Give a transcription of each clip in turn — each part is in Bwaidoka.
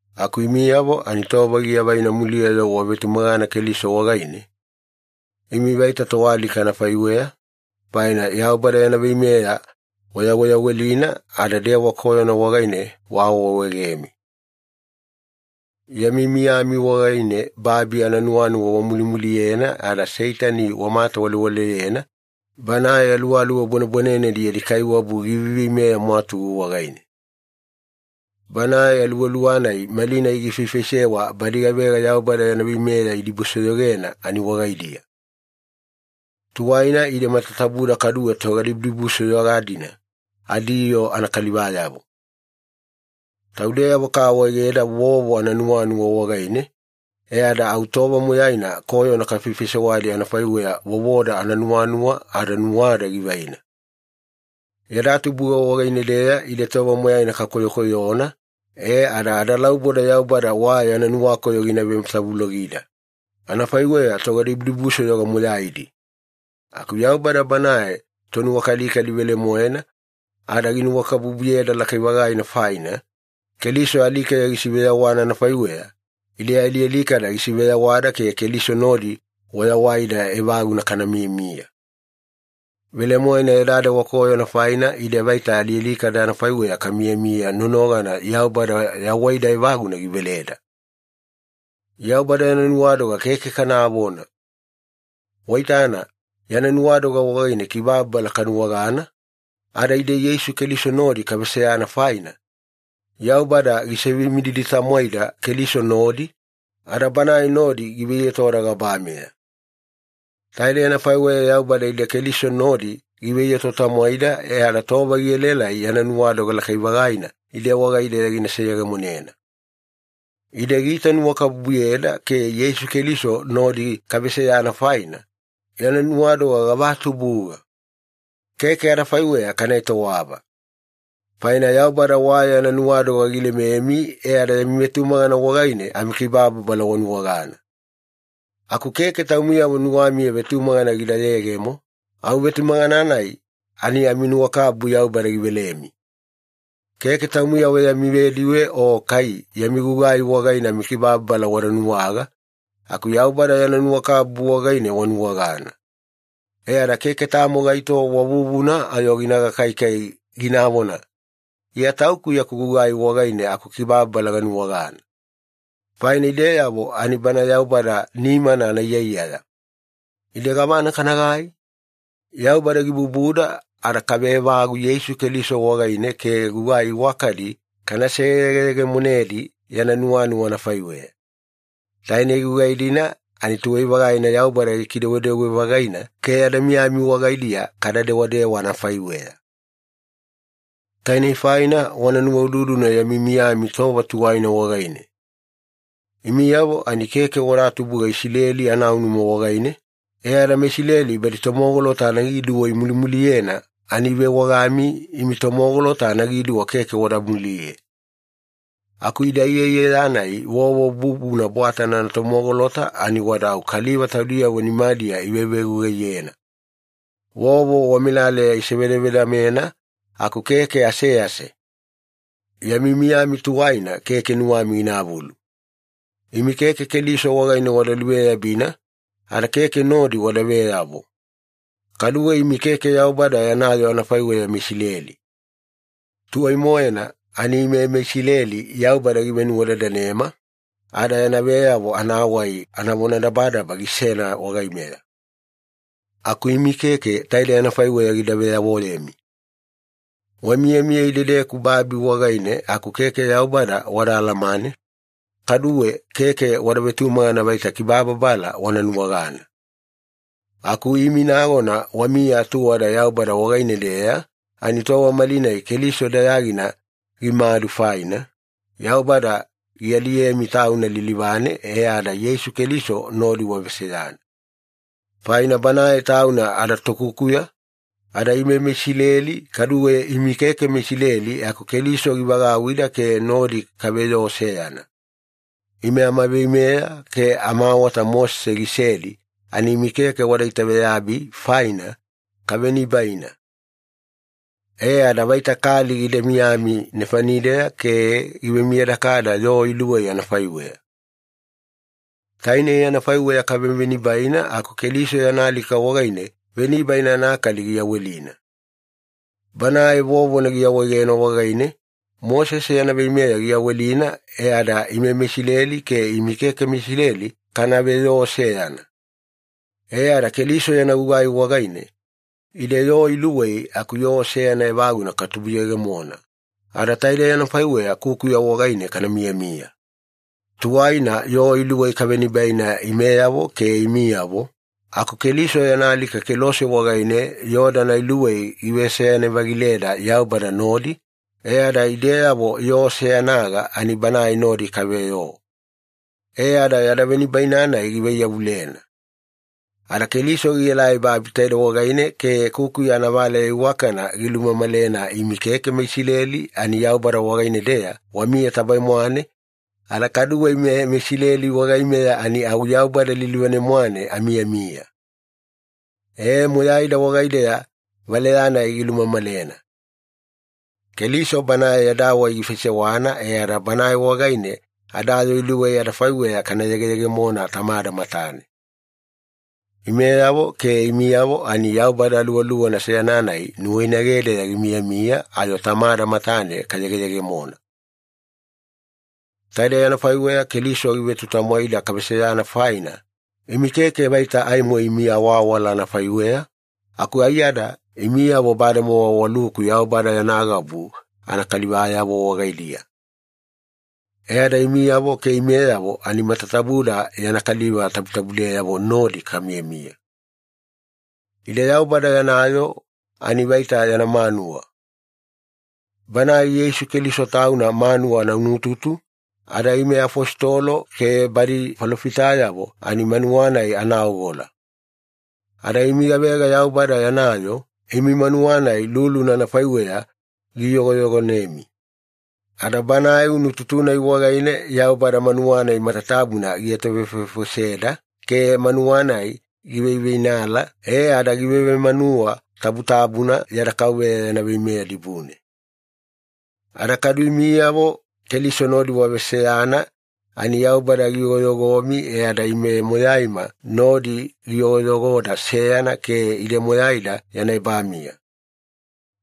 Aku imiyavo ani tova giavaina muliya-yo wavetumagana Keliso wagaine, imi vaita toalika anafaiweya, faina Yaubada yana veimeya wayaweyawelina ada dewa koyona wagaine waawaawaegemi. Yami miyami wagaine babi ananuwanuwa wamulimuliyena ada Seitani wamatawalewaleyena, banae aluwaluwa bwanebwanenedi yadi kaiwabu giveiveimeya mwatugu wagaine. Banae aluwaluwa-nai malinai gifaifaisewa badi gavega Yaubada yana veimeya idibusoyogena ani wagaidiya. Tuwaina ide matatabuda kaduwe togadibudibusoyoga-dina adiyoo anakalivayavo. Taudeyavo kaawaegeda vovo ananuwanuwa wagaine, e ada au tova moyaina koyona kafaifaisewadi anafaiweya vovoda ananuwanuwa ada nuwada givaina. Yada tubuga wagaine-deya ide tova moyaina kakoyokoyona, e ada adalauboda Yaubada wa yana nuwakoyo gina vematavulogida, anafaiweya togadibudibusoyoga moyaidi. Aku Yaubada Banae Tonuwakalikali velemoena, ada ginuwakabubuyeda lakai-vagaina faina, Keliso alikeya gisiveyawana anafaiweya, ide alialikada gisiveyawada ke Keliso nodi wayawaida evaguna kamiyamiya. Velemoena yada dewa koyona faina, ide vaita alialikada anafaiweya kamiyamiya nonogana Yaubada yawaida evaguna giveleda. Yaubada yana nuwadoga keke kanavona! Waitana, yana nuwadoga wagaine kibababala kanuwagana, ada ide Yeisu Keliso nodi kaveseyana faina, Yaubada gisivemididi-tamwaida Keliso nodi, ada Banae nodi giveiyotoda gabameya. Taidei anafaiweya Yaubada ide Keliso nodi giveiyoto-tamwaida e ada tova gielaelai yana nuwadoga lakai-vagaina ide wagaideya gina seyegemonena. Ide giitanuwakabubuyeda ke Yeisu Keliso nodi kaveseyana faina, yana nuwadoga gavatubuga! Keke adafaiweya kana etowava. Faina Yaubada wa yana nuwadoga gilememi e ada yami vetumagana wagaine amikibababala wanuwagana. Aku keke taumiyavo nuwamiya vetumagana gida yegemo, au vetumagana-nai ani aminuwakabubu Yaubada givelemi. Keke taumiyavo yami vediwe o kai yami gugai wagaine amikibababala wada nuwaga, aku Yaubada yana nuwakabubu wagaine wanuwagana. E ada keke tamo gaito wa vuvuna ayo gina gakaikai, ginavona, “Iya tauku yaku gugai wagaine akukibababala ganuwagana.” Faina ideyavo ani Bana Yaubada nimana anaiyaiyaya. Ide gavana kanagai? Yaubada gibubuda ada kaveevagu Yeisu Keliso wagaine ke gugai iwakadi kana seyegeyegemonedi yana nuwanuwa anafaiweya. Tainei gugai-dina ani tuwai-vagaina Yaubada gikidewadewa-vagaina ke yada miyami wagaidiya kada dewadewa anafaiweya. Tainei faina wana nuwaududuna yami miyami tova tuwaina wagaine. Imiyavo ani keke wada tubuga Isileli anaunuma wagaine, e ada badi meIsileli tomogolota anagiduwa imulimuliyena ani ivewagami ‘imi tomogolota anagiduwa keke wada muliye’. Aku ida iyaiyaya-nai vovo bubuna bwatana anatomogolota ani wada au kaliva taudiyavo nimadiya ivevegugaiyena. Vovo wamelaleya isivedavedamena aku keke asease. Yami miyami tuwaina keke nuwami ginavulu. Imi keke Keliso wagaine wada luveyabina, ada keke nodi wada veyavo. Kaduwe imi keke Yaubada yana yoo anafaiweya meIsileli. Tuwai-moena ani ime meIsileli Yaubada givenuwadadanema, ada yana veyavo anawai anavonadabadaba gisena wagaimeya. Aku imi keke taidei anafaiweya gida veyavoyemi. Wamiyamiya idedeku babi wagaine aku keke Yaubada wadaalamane, kaduwe keke wada vetumagana vaita kibababala wana nuwagana. Aku imi nagona wamiya atuwada Yaubada wagaine-deya ani tova malinai Keliso dayagina gimadu faina, Yaubada gialiyemi Tauna lilivane e ada Yeisu Keliso nodi waveseyana. Faina Banae Tauna adaTokukuya, ada ime meIsileli kaduwe imi keke meIsileli aku Keliso givagauwida ke nodi kaveyoo seyana. Ime amaveimeya ke amaawata Mosese gisedi ani imi keke wada itaveyabi faina, kavenibaina. E ada vaita kali gida miyami nefanideya ke givemiyadakada yoo iluwei anafaiweya. Tainei anafaiweya kavevenibaina aku Keliso yana alika wagaine venibaina anakali giyawelina. Banae vovona giawaegena wagaine, Mosese yana veimeya giyawelina e ada ime meIsileli ke imi keke meIsileli kana veyoo seyana. E ada Keliso yana gugai wagaine, ide yoo iluwei aku yoo seyana evaguna katubuyegemona, ada taidei anafaiweya kukuya wagaine kana miyamiya. Tuwaina yoo iluwei kavenibaina imeyavo ke imiyavo, aku Keliso yana alika kelose wagaine yoo-dana iluwei giveseyana-vagileda Yaubada nodi, e ada ideyavo yoo seyanaga ani Banae nodi kaveyoo. E ada yada venibaina-nai givaiyavulena. Ada Keliso gielai babi taidei wagaine ke kukuya anavaleya iwakana gilumamalena imi keke meIsileli ani Yaubada wagaine-deya wamiya tabae-mwane, ada kaduwe ime meIsileli wagaimeya ani au Yaubada lilivane-mwane amiyamiya. E, moyaida wagaideya valeya-nai gilumamalena. Keliso Banae yada wai gifaisewana e ada Banae wagaine yada yoo iluwei adafaiweya kana yegeyegemona Tamada matane. Imeyavo ke imiyavo ani Yaubada Aluwaluwana seyana-nai nuwainagedeya gimiyamiya ayo Tamada matane kayegeyegemona. Taidei anafaiweya Keliso givetutamwaida kaveseyana faina, imi keke vaita aimo imi awaawala anafaiweya, aku aiyada imiyavo bademowa waluku Yaubada yana gabu anakalivayavo wagaidiya. E ada imiyavo ke imeyavo ani matatabuda yana kaliva tabutabudeyavo nodi kamiyamiya. Ide Yaubada yana yoo ani vaita yana manuwa. Banae Yeisu Keliso Tauna manuwa anaunututu, ada ime afositolo ke badi falofitayavo ani manuwa-nai anaogola. Ada imi gavega Yaubada yana yoo, imi manuwa-nai luluna anafaiweya giiyogoyogonemi. Ada Banae unututu-nai wagaine Yaubada manuwa-nai matatabuna gietovefovefoseda ke manuwa-nai giveiveinala e ada givevemanuwa tabutabuna yada Kauveya yana veimeya dibune. Ada kadu imiyavo Keliso nodi waveseyana ani Yaubada giyogoyogomi, e ada ime moyaima nodi giyogoyogoda seyana ke ide moyaida yana ebamiya.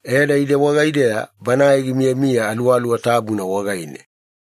E ada ide wagaideya Banae gimiyamiya Aluwaluwa Tabuna wagaine.